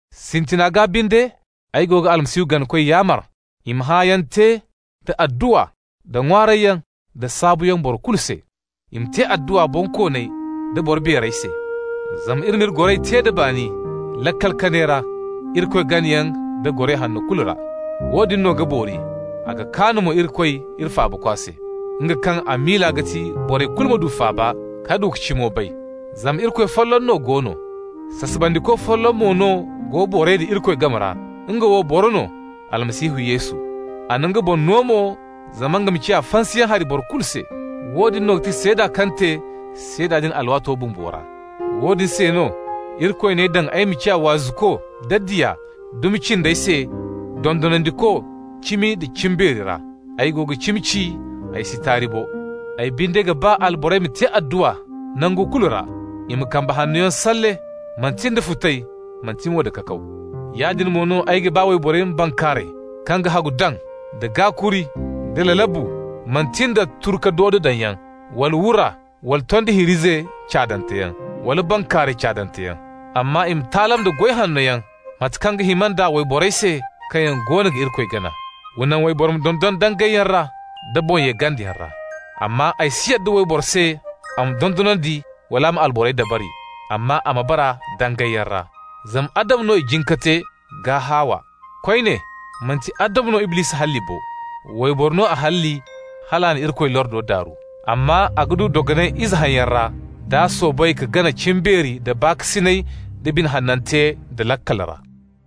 Sintina gaa binde, ay go ga Almasihu ganakoy yaamar i ma hãayaŋ te, da adduwa, da ŋwaarayyaŋ, da saabuyaŋ borey kulu se. I ma te adduwa bonkooney da boro beerey se, zama iri m'iri goray te da baani laakal kanay ra, Irikoy ganayaŋ da goray hanno kulu ra. Woodin no ga boori, a ga kaan mo Irikoy iri Faabakwa se, nga kaŋ a miila ga ti borey kulu ma du faaba ka du ka cimo bay. Zama Irikoy folloŋ no go no, sasabandiko folloŋ mo no go borey da Irikoy game ra, nga wo boro no, Almasihu Yesu. A na nga boŋ no mo zama nga ma ciya fansayaŋ hari boro kulu se. Woodin no ga ti seeda kaŋ te seeda din alwaato bumbo ra. Woodin se no Irikoy n'ay daŋ ay ma ciya waazuko da diya, dumi cindey se dondonandiko cimi nda cimbeeri ra. (Ay go ga cimi ci, ay si taari bo.) Ay binde ga ba alborey ma te adduwa nangu kulu ra. I ma kambe hannoyaŋ salle, manti nda futay, manti mo da kakaw. Yaadin mo no ay ga ba wayborey ma bankaaray kaŋ ga hagu daŋ da gaakuri, da lalabu, manti nda turu ka doodo daŋyaŋ, wala wura, wala tondi hiir'ize caadanteyaŋ, wala bankaaray caadanteyaŋ. Amma i ma taalam da goy hanno yaŋ, mate kaŋ ga hima nd'a wayborey se kaŋ yaŋ goono ga Irikoy gana. Wa naŋ wayboro ma dondon dangayyaŋ ra da boŋ-ye-gandayaŋ ra. Amma ay si yadda wayboro se a ma dondonandi wala a ma alborey dabari, amma a ma bara dangayyaŋ ra. Zama Adamu no i jin ka te, gaa Hawa. Koyne, manti Adamu no Iblisi halli bo, wayboro no a halli, hal a na Irikoy lordo daaru. Amma a ga du dogonay ize hayyaŋ ra d'a soobay ka gana cimbeeri, da baakasinay, da bine hanante, da laakal ra.